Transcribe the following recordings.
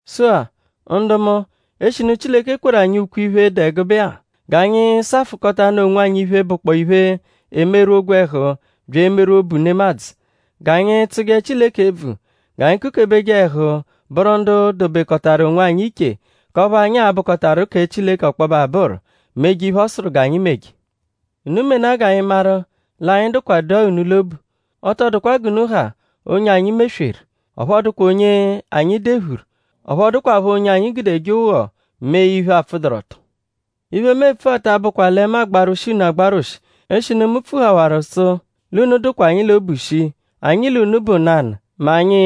Sụ-a; ndu mu; eshinu Chileke kweru anyi ukwe-iphe dụ ẹgube-a; g'anyi safụkotanu onwanyi iphe, bụkpoo iphe, emerwụ ogwẹhu bya emerwụ obu nemadzụ. G'anyi tsụje Chileke ebvu; g'anyi kukebeje ẹhu bụru ndu dobekọtaru onwanyi iche k'ọphu anyi a-bụkotaru kẹ Chileke ọkpobe abụru; meje iphe, ọ sụru g'anyi meje. Unu menaa g'anyi maru l'anyi dụkwadua unu l'obu. Ọ tọ dụkwa g'unu ha onye anyi mesweru; ọphu ọ dụkwa onye anyi dephuru; ọphu ọ dụkwapho onye anyi gudeje ụgho mee iphe, apfụduru-ọto. Iphe, mu epfua ta abụkwa lẹ mu agbarwụshi unu agbarwụshi eshinu mu pfuhawaru sụ l'unu dụkwa anyi l'obu shii. Anyi l'unu bụ nanụ; mẹ anyi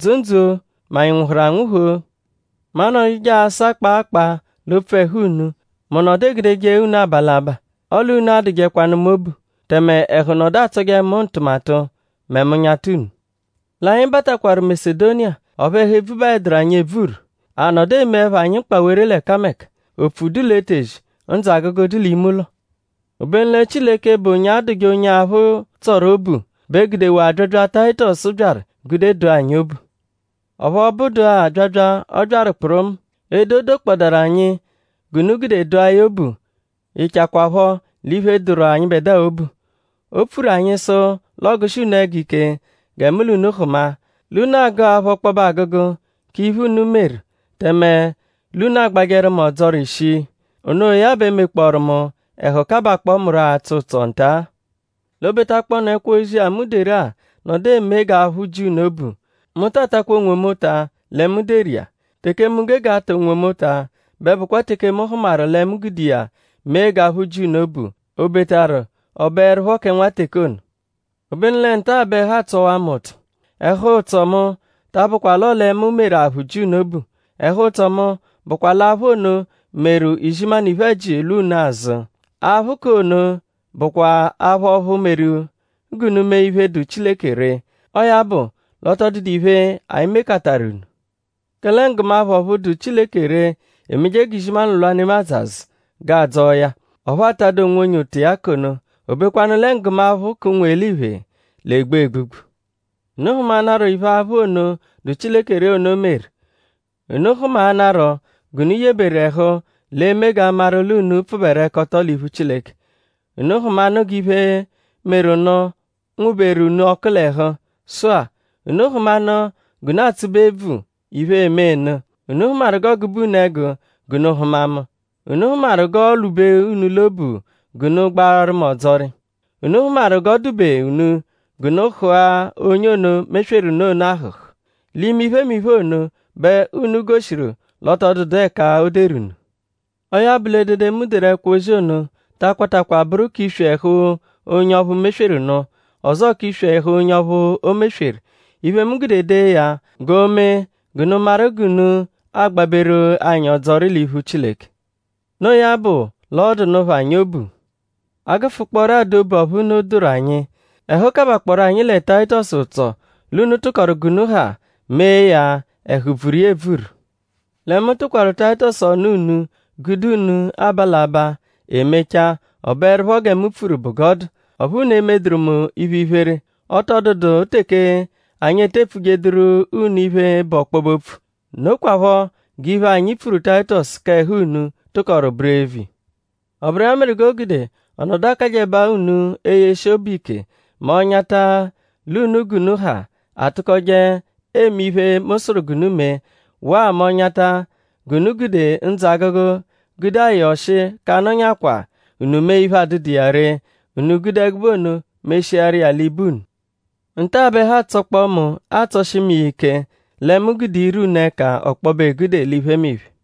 dzụ ndzụ-o; mẹ anyi nwụhuru anwụhu-o. Mu anọduje asa kpaa kpaa l'opfu ẹhu unu; mu nọdu egudeje unu aba l'abaa. Anyi nọ lẹ mkpamẹhu; ọle unu adụjekwanu mu obu; tẹme ẹhu nọdu atsọje mu ntụmatu mẹ mu -nyata unu. L'anyi batakwaru Masedoniya; ọphu ẹhu ebvubaẹduru anyi ebvuru. A nọdu emeẹpho anyi mkpawere l'ẹkameka. Opfu dụ l'etezi; ndzụ-agụgu dụ l'ime-ụlo. Obenu lẹ Chileke, bụ onye adụje onye aphụ tsọru obu bẹ gudewaa abyabya, Tayitọsu byaru gude dụa anyi obu. Ọphu ọ bụdua abyabya, ọ byaru kpụrumu; edo, o dokpọodaru anyi g'unu gude dụa ya obu yịchakwapho l'iphe, dụru anyịbedua obu. O pfuru anyi sụ l'ọogushi unu ẹgu ike gẹ mu l'unu hụma; l'unu agụ aphụ ọkpobe agụgu k'iphe, unu meru; tẹme l'unu agbajẹru mu ọdzori shii. Onoya bẹ mekpọoru mu ẹhu kabakpọo mu atsọ ụtso nta-a. L'o betakpọonu ẹkwo-ozi-a, mu deru-a nọdu eme g'aphụ ji unu obu; mu ta atakwa onwomu ụta lẹ mu deru iya. Teke mu gege ata onwomu ụta bụkwa teke mu hụmaru lẹ mu gude iya mee g'aphụ ji unu obu; obetaru ọ bụerupho kẹ nwa teke ono. Obenu lẹ nta-a bẹ ẹhu atsọwaa mu ụtso. Ẹhu-ụtso mu ta abụkwa l'ọo lẹ mu meru aphụ ji unu obu. Ẹhu-ụtso mu bụkwa l'aphụ ono meru izimanụ iphe-ẹji unu lwa unu azụ. Aphụ k'ono bụkwa aphụ ọphu meru g'unu mee iphe, dụ Chileke ree. Ọo ya bụ l'ọ tọ dụdu iphe, anyi mekataru unu. Kẹle nggụmaphu ọphu dụ Chileke ree emeje g'izimanụ lwa nemadzụ azụ g'adzọo ya; ọphu atadụ onwonye ụta iya k'ono. O bekwanụ lẹ nggụmaphu k'ụnwu-eliphe l'egbu egbugbu. Unu hụmaanaro iphe aphụ ono, dụ Chileke ree ono meru. Unu hụmaanaro g'unu yeberu ẹhu l'eme g'a maru l'unu pfụberekoto l'iphu Chileke. Unu hụmanu g'iphe, meru nụ nwụ-beru unu ọku l'ẹhu. Sụ-a; unu hụmanu g'unu atsụbe ebvu iphe e-menu. Unu hụmaru g'ọogube unu ẹgu g'unu hụma mu; unu hụmaru g'oolwube unu l'obu g'unu gbaaru mu ọdzori. Unu hụmaru g'ọ dụ-be unu g'unu hụ̀a onye ono, mesweru nụ ono ahụ̀hù. L'ime iphemiphe ono bẹ unu goshiru l'ọ tọ dụdu ẹka o deru unu. Ọo ya bụ l'edede, mu deru ẹkwo-ozi ono ta akwatakwa bụru k'iswi ẹhu onye ọphu mesweru nụ; ọzoo k'iswi onye ọphu o mesweru. Iphe, mu gude dee ya bụkwa g'o mee g'unu maru g'unu agbaberu anyi ọdzori l'iphu Chileke. Noo ya bụ l'ọodu nụ phọ anyi obu. A -gụfukpooro adụ obu ọphu unu dụru anyi; ẹhu kabakpọoro anyi lẹ Tayitọsu ụtso l'unu tụkoru g'unu ha mee ya ẹhu bvuru iya ebvuru. Lẹ mu tụkwaru Tayitọsu ọnu unu; gude unu aba l'abaa; e mechaa; ọ bụerupho gẹ mu pfuru bụ g'ọ dụ; ọphu unu emeduru mu iphe-iphere. Ọ tọ dụdu teke anyi ete epfujeduru unu iphe, bụ ọkpobe-opfu. Nokwaphọ g'iphe, anyi pfuru Tayitọsu k'ẹhu unu tụkoru bụru eviya. Ọ bụru iya meru g'o gude ọ nọdu akajẹbaa unu eyeshi obu ike mẹ ọ -nyata l'unu g'unu ha atụkoje eme iphe, mu sụru g'unu mee; waa mẹ ọ -nyata g'unu gude ndzụ-agụgu gude ayọ ọshi k'anọnyakwaa unu mee iphe, adụdu iya ree; unu gude ẹgube ono meshiaru iya l'ibe unu. Nta-a bẹ ẹhu atsọkpoo mu atsọshi mu iya ike lẹ mu gude ire unu ẹka ọkpobe egude l'iphemiphe.